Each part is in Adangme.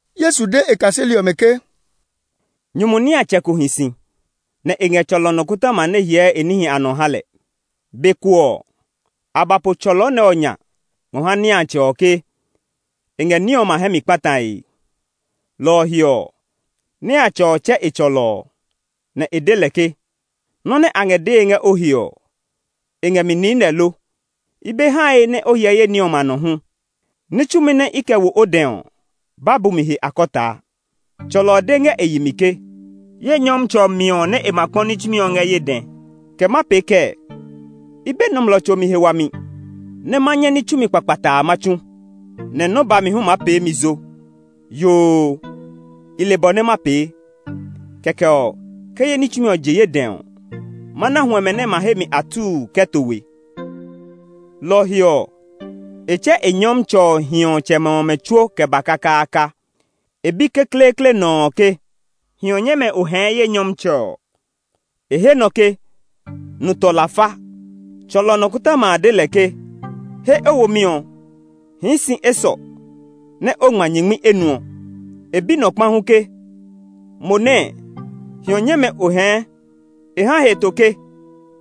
Yesu de e kaseli ɔmɛ ke, “Nyumu niatsɛ ko hi si, nɛ e ngɛ tsɔlɔ nɔkɔtɔma nɛ hyɛɛ e níhi a nɔ ha lɛ. Be ko ɔ, a ba po tsɔlɔ nɛ ɔ nya ngɔ ha niatsɛ ɔ ke e ngɛ e ní ɔmɛ a hɛ mi kpatae. Lɔ ɔ he ɔ, niatsɛ ɔ tsɛ e tsɔlɔ ɔ, nɛ e de lɛ ke, ‘Nɔ́ nɛ a ngɛ dee ngɛ o he ɔ, e ngɛ mi niinɛ lo? I be hae nɛ o hyɛ ye ní ɔmɛ a nɔ hu; ní tsumi nɛ i ngɔ kɛ wo o dɛ ɔ, ba bu he akɔtaa.’ Tsɔlɔ ɔ de ngɛ e yi mi ke, ‘Ye nyɔmtsɛ ɔ miɔ nɛ e ma kpɔ ní tsumi ɔ ngɛ ye dɛ; kɛ ma pee kɛɛ? I be nɔmlɔ tso mi he wami nɛ ma nyɛ ní tsumi kpakpataa ma tsu, nɛ nɔ́ bami hu maa pee mi zo. Yoo, i le bɔ nɛ ma pee, kɛkɛ ɔ, ke ye ní tsumi ɔ je ye dɛ ɔ, ma na huɛmɛ nɛ ma he mi atuu kɛ to we.’ “Lɔ ɔ he ɔ, e tsɛ e nyɔmtsɛ ɔ hiɔtsɛmɛ ɔmɛ tsuo kɛ ba kakaaka. E bi kekleekle nɔ ɔ ke, ‘Hiɔ nyɛmɛ o hɛɛ ye nyɔmtsɛ ɔ?’ E he nɔ ke, ‘Nu tɔ lafa.’ Tsɔlɔ nɔkɔtɔma a de lɛ ke, ‘He o womi ɔ! Hii si esɔ, nɛ o ngma ke o hɛɛ hiɔ nu tɔ nyingmi enuɔ.’ E bi nɔ kpa hu ke, ‘Mo nɛɛ, hiɔ nyɛmɛ o hɛɛ?’ E ha heto ke,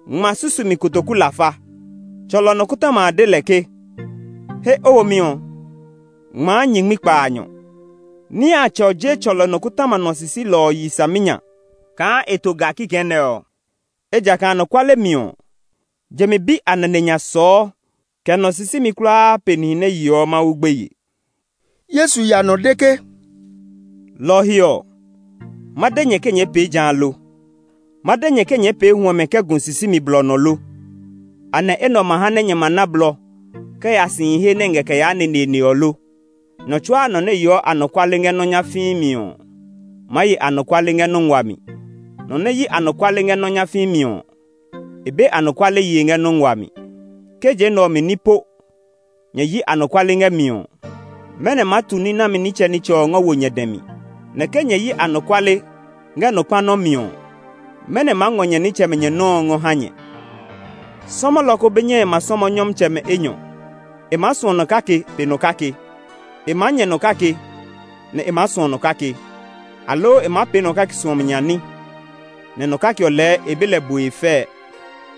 ‘Ngma susumi kotoku lafa.’ Tsɔlɔ nɔkɔtɔma a de lɛ ke, ‘He o womi ɔ; ngmaa nyingmi kpaanyɔ.’ “Niatsɛ ɔ je tsɔlɔ nɔkɔtɔma nɔ sisilɔ ɔ yi saminya kaa e to ga kikɛ nɛ ɔ. Ejakaa anɔkuale mi ɔ, je mi bi a nane nya sɔɔ kɛ nɔ sisimi kulaa pe nihi nɛ yeɔ Mawu gbeye.” Yesu ya nɔ de ke, “Lɔ ɔ he ɔ, ma de nyɛ ke nyɛɛ pee ja lo? Ma de nyɛ ke nyɛɛ pee huɛmɛ kɛ gu sisimi blɔ nɔ lo? Anɛ enɛ ɔ ma ha nɛ nyɛ ma na blɔ kɛ ya sihi he nɛ ngɛ kɛ yaa neneene ɔ lo? Nɔ tsuaa nɔ nɛ yeɔ anɔkuale ngɛ nɔ́ nyafii mi ɔ maa ye anɔkuale ngɛ nɔ́ nguaa mi; nɔ nɛ yi anɔkuale ngɛ nɔ́ nyafii mi ɔ, e be anɔkuale yee ngɛ nɔ́ nguaa mi. Ke je nɛ ɔ mi ní po nyɛ yi anɔkuale ngɛ mi ɔ, mɛnɔ maa tu ní nami nitsɛnitsɛ ɔ ngɔ wo nyɛ dɛ mi? Nɛ ke nyɛ yi anɔkuale ngɛ nɔ kpa nɔ́ mi ɔ, mɛnɔ maa ngɔ nyɛ nitsɛmɛ nyɛ nɔ́ ɔ ngɔ ha nyɛ? “Sɔmɔlɔ ko be nyɛe ma sɔmɔ nyɔmtsɛmɛ enyɔ; e maa suɔ nɔ kake pe nɔ kake; e maa nyɛ nɔ kake, nɛ e maa suɔ nɔ kake; aloo e maa pee nɔ kake suɔmi nya ní, nɛ nɔ kake ɔ lɛɛ e be lɛ bue fɛɛ.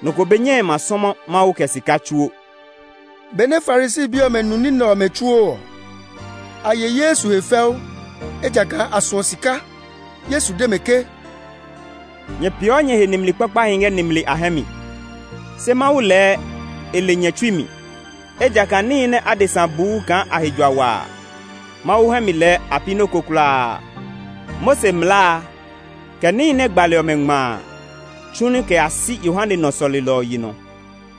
Nɔ ko be nyɛe ma sɔmɔ Mawu kɛ sika tsuo.” Benɛ Farisi bi ɔmɛ nu ní nɛ ɔmɛ tsuo ɔ, a ye Yesu he fɛu, ejakaa a suɔ sika. Yesu de mɛ ke, “Nyɛ peeɔ nyɛ he nimli kpakpahi ngɛ nimli a hɛ mi, se Mawu lɛɛ e le nyɛ tsui mi. Ejakaa níhi nɛ adesa buu kaa a he jua wa a, Mawu hɛ mi lɛɛ a pi nɔ́ ko kulaa. “Mose mlaa a, kɛ níhi nɛ gbali ɔmɛ ngma a tsu ní kɛ ya si Yohane nɔ sɔlelɔ ɔ yi nɔ.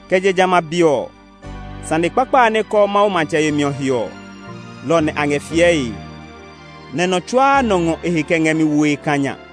Kɛ je jamɛ a be ɔ, sane kpakpa a nɛ kɔɔ Mawu matsɛ yemi ɔ he ɔ, lɔ ɔ nɛ a ngɛ fiɛe. Nɛ nɔ tsuaa nɔ ngɔ e he kɛ ngɛ mi woe kã nya.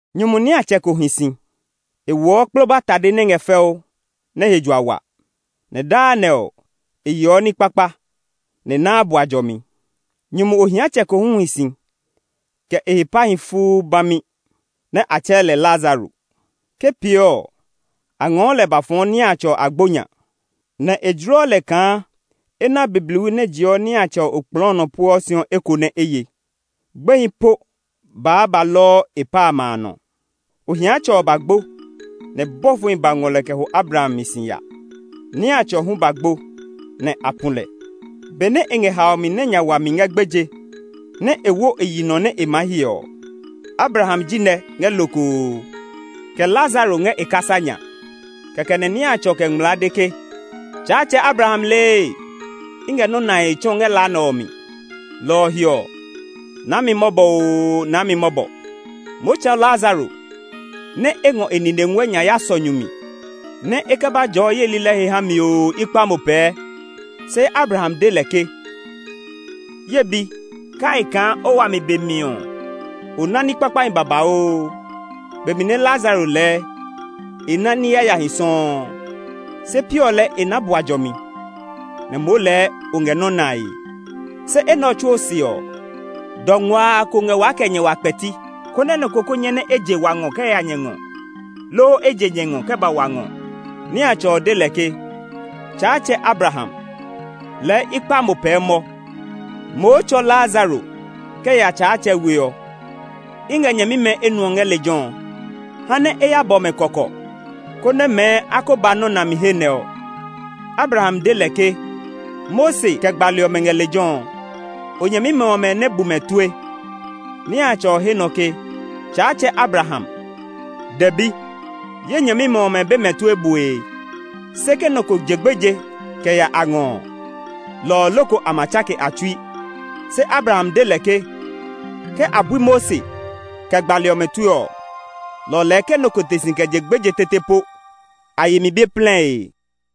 “Nyumu niatsɛ ko hi si. E woɔ kploba tade nɛ ngɛ fɛu, nɛ he jua wa; nɛ daa nɛ ɔ, e yeɔ ní kpakpa, nɛ e naa bua jɔmi. Nyumu ohiatsɛ ko hu hi si kɛ e he pahi fuu bami; nɛ a tsɛɛ lɛ Lazaro. Ke pee ɔ, a ngɔɔ lɛ ba fɔɔ niatsɛ ɔ we agbo nya, nɛ e jloɔ lɛ kaa e na bibliwi nɛ jeɔ niatsɛ ɔ we okplɔɔ ɔ nɔ pueɔ si ɔ eko nɛ e ye. Gbehi po baa ba lɔɔ e pa amɛ nɔ. “Ohiatsɛ ɔ ba gbo, nɛ bɔfohi ba ngɔ lɛ kɛ ho Abraham mi si ya. Niatsɛ ɔ hu ba gbo, nɛ a pu lɛ. Benɛ e ngɛ haomi nɛ nya wa mi ngɛ gbeje, nɛ e wo e yi nɔ nɛ e maa hyɛ ɔ, Abraham ji nɛ ngɛ lokoo, kɛ Lazaro ngɛ e kasa nya. Kɛkɛ nɛ niatsɛ ɔ kɛ ngmlaa de ke, ‘Tsaatsɛ Abraham lee! I ngɛ nɔ́ nae tsɔ ngɛ la nɛ ɔ mi! Lɔ ɔ he ɔ, naa mi mɔbɔ oo, naa mi mɔbɔ! Mao tsɔ Lazaro nɛ e ngɔ e nine nguɛ nya ya sɔ nyu mi, nɛ e kɛ ba jɔɔ ye lilɛ he ha mi oo, i kpa mo pɛɛ!’ “Se Abraham de lɛ ke, ‘Ye bi, kai kaa o wami be mi ɔ, o na ní kpakpahi babauu, be mi nɛ Lazaro lɛɛ e na ní yayahi sɔuu. Se piɔ lɛɛ e na bua jɔmi, nɛ moo lɛɛ o ngɛ nɔ́ nae. Se enɛ ɔ tsuo se ɔ, dɔ nguaa ko ngɛ waa kɛ nyɛ wa kpɛti, konɛ nɔ ko kó nyɛ nɛ e je wa ngɔ kɛ ya nyɛ ngɔ, loo e je nyɛ ngɔ kɛ ba wa ngɔ.’ Niatsɛ ɔ de lɛ ke, ‘Tsaatsɛ Abraham, lɛɛ i kpa mo pɛɛ mɔ; moo tsɔ Lazaro kɛ ya ye tsɛ we ɔ. I ngɛ nyɛmimɛ enuɔ ngɛ lejɛ ɔ. Ha nɛ e ya bɔ mɛ kɔkɔ, konɛ mɛɛ a ko ba nɔ́ nami he nɛ ɔ.’ “Abraham de lɛ ke, ‘Mose kɛ gbali ɔmɛ ngɛ lejɛ ɔ; o nyɛmimɛ ɔmɛ nɛ bu mɛ tue.’ Niatsɛ ɔ he nɔ ke, ‘Tsaatsɛ Abraham, dɛbi; ye nyɛmimɛ ɔmɛ be mɛ tue bue. Se ke nɔ ko je gbeje kɛ ya a ngɔ ɔ, lɔ ɔ loko a ma tsake a tsui.’ Se Abraham de lɛ ke, ‘Ke a bui Mose kɛ gbali ɔmɛ tue ɔ, lɔ ɔ lɛɛ ke nɔ ko te si kɛ je gbeje tete po, a yi mi be plɛe.’”